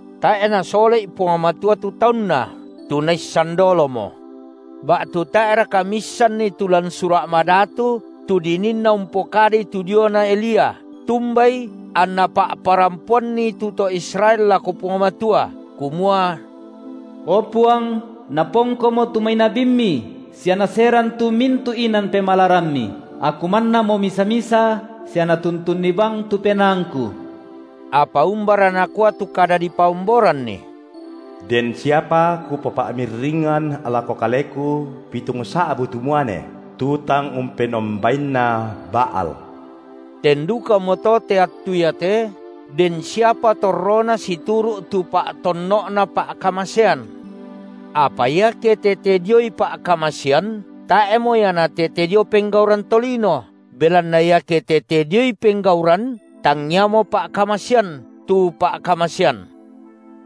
Tae’ Nasole’i Puang Matua tu taunNa, tu Naissan dolomo. Ba’tu tae’raka miissanni tu lan Sura’ Madatu tu dininna umpokadai tu diona Elia, tumbai anna pa’parampoanni tu to Israel lako Puang Matua, kumua: O Puang, napongkomo tu mai nabimMi sia naseran tu mintu’ inan pemalaramMi; aku mannamo misa-misa sia natuntunni bang tu penaangku. Apa umbara nakua tu kada dipaomboranni? Den siapa Kupopa’mirringan lako Kaleku pitungsa’bu tu muane, tu tang umpenombainna Baal. Ten dukamoto te attu iate den siapa torrona situru’ tu pa’tonno’na pa’ka- masean. Apa iake tete dioi pa’kamasean, tae’mo ia natete dio penggauran tolino, belanna iake tete dioi penggauran, tangiamo pa’kamasean tu pa’kamasean.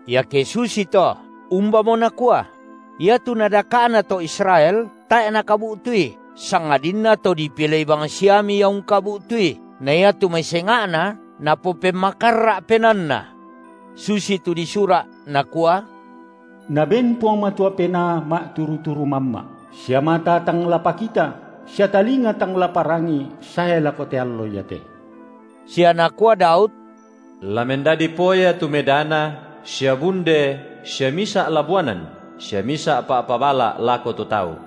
Iake susito, umbamo nakua? Iatu nadaka’na to Israel, tae’ nakabu’tui, sangadinna to dipilei bangsiami ia ungkabu’tui, na iatu mai senga’na napopemmakarra’ penaanna. Susitu disura’, nakua: Naben Puang Matua penaa ma’turu-turu mamma’, sia mata tang la pakita, sia talinga tang la parangi sae lako te allo iate. Sia nakua Daud: La mendadi poya tu medana sia bunde sia misa’ labuanan sia misa’ pa’pabala’ lako tu tau.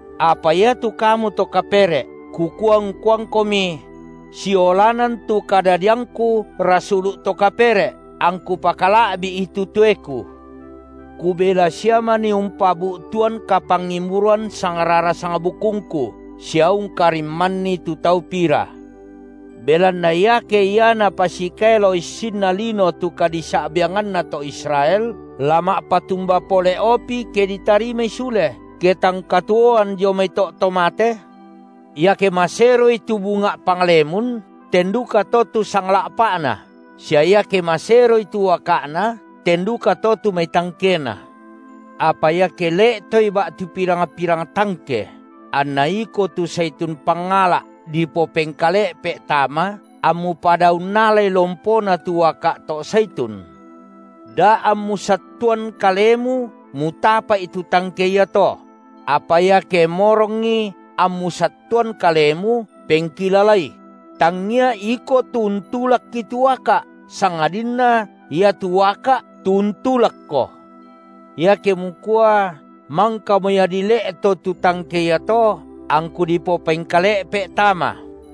Apa iatu kamu to kapere’, kukua ungkuangkomi: Siolanan tu kadadiangku rasulu’ to kapere’, angku pakala’bi’i tu toeku, kubela sia manii umpabu’tuan kapangimburuan sangrara sangbukungku sia ungkarimmanni tu tau pira. Belanna iake ia napasikaelo issinna lino tu kadisa’biangananna to Israel, la ma’patumba pole’opi ke ditarimai sule, ke tang katuoan dio mai to’ to mate? Iake maseroi tu bunga’ panglemun, ten dukato tu sangla’pa’na, sia iake maseroi tu uaka’na, ten dukato tu mai tangkena. Apa iake le’toi ba’tu pirang-pirang tangke, anna iko tu saitun pangala’, dipopengkale’pe’ tama, ammu pada unnalai lompona tu uaka’ to’ saitun, da ammu sattuan kalemu mutapa’i tu tangke iato. Apa iake morongi ammu sattuan kalemu, pengkilalai: tangia iko tu untulakki tu uaka’, sangadinna iatu uaka’ tu untulakko. Iake mukua: Mangkamo ia dile’to tu tangke iato, angku dipopengkale’pe’ tama.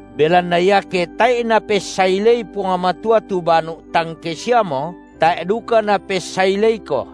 Belanna iake tae’i Napessailei Puang Matua tu banu’ tangke siamo, tae’ duka Napessaileiko.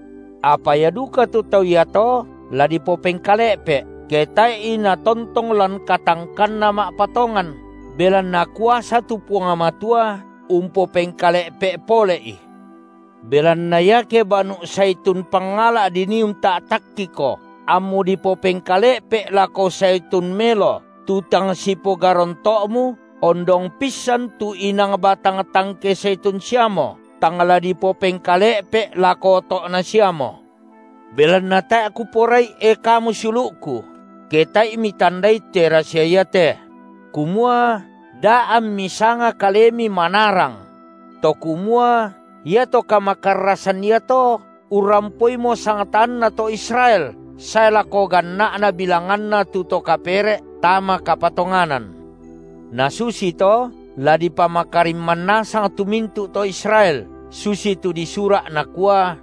Apa ia duka tu tau iato la dipopengkale’pe’, ke tae’i natontong lan katangkanna ma’patongan, belanna kuasa tu Puang Matua umpopengkale’pe’ pole’i. Belanna iake banu’ saitun pangala’ dinii unta’takkiko, ammu dipopengkale’pe’ lako saitun melo tu tang sipogaronto’mu, ondong pissan tu inang batang tangke saitun siamo tang la dipopengkale’pe’ lako oto’na siamo. Belanna tae’ kuporai, e kamu siulu’ku, ke tae’i mitandai te rasia iate, – kumua da ammi sanga kalemi manarang – to kumua iato kamakarrasan iato urrampoimo sangtaanna to Israel sae lako ganna’na bilanganna tu to kapere’ tama kapatonganan. Na susito la dipamakarimman nasang tu mintu’ to Israel, susitu disura’ nakua: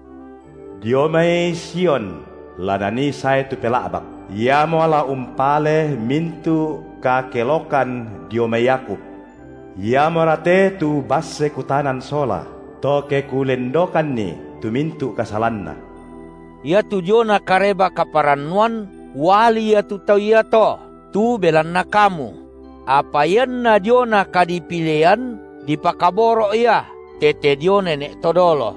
Dio mai Sion la Nanii sae tu Pela’bak; Iamo la umpale mintu’ kakelokan dio mai Yakub. Iamora te tu basse Kutanan sola, to ke Kulendokanni tu mintu’ kasalanna. Iatu diona Kareba-kaparannuan uali ia tu tau iato tu belanna kamu; apa ianna diona kadipilean, dipakaboro’ ia tete dio nene’ to dolo.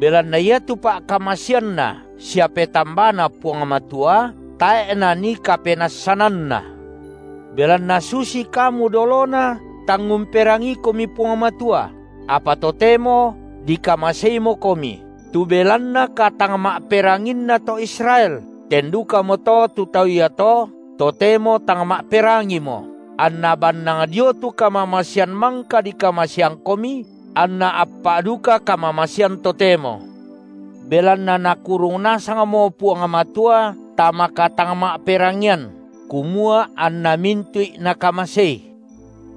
Belanna iatu pa’kamaseanNa sia petambaNa Puang Matua tae’ nanii kapenassananNa. Belanna susi kamu dolona tang umperangiikomi Puang Matua, apa totemo dikamaseimokomi tu belanna katangma’peranginna to Israel, ten dukamoto tu tau iato totemo tang ma’perangimo, anna bannang dio tu kamamasean mangka dikamaseangkomi, anna appa’ duka kamamasean totemo. Belanna Nakurung nasangmo Puang Matua tama katangma’perangian, kumua anna mintu’i Nakamasei.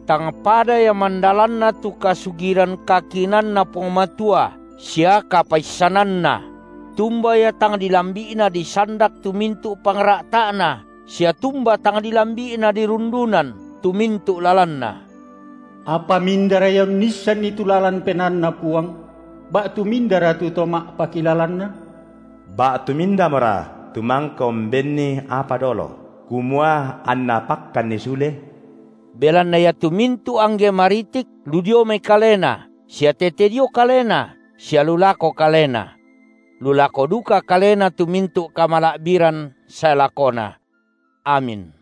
Tang pada ia mandalanna tu kasugiran kakinaanNa Puang Matua sia kapaissananNa! Tumba ia tang dilambi’na disandak tu mintu’ pangra’ta’Na sia tumba tang dilambi’na dirundunan tu mintu’ lalanNa. Apa mindara ia unnissanni tu lalan penaanNa Puang? ba’tu mindara tu to ma’pakilalanNa? Ba’tu mindamora tu mangka umbenNi apa dolo kumua anNa pakkanni sule? Belanna iatu mintu’ angge maritik lu dio mai Kalena sia tete dio Kalena sia lu lako Kalena. Lu lako duka Kalena tu mintu’ kamala’biran sae lakona. Amin.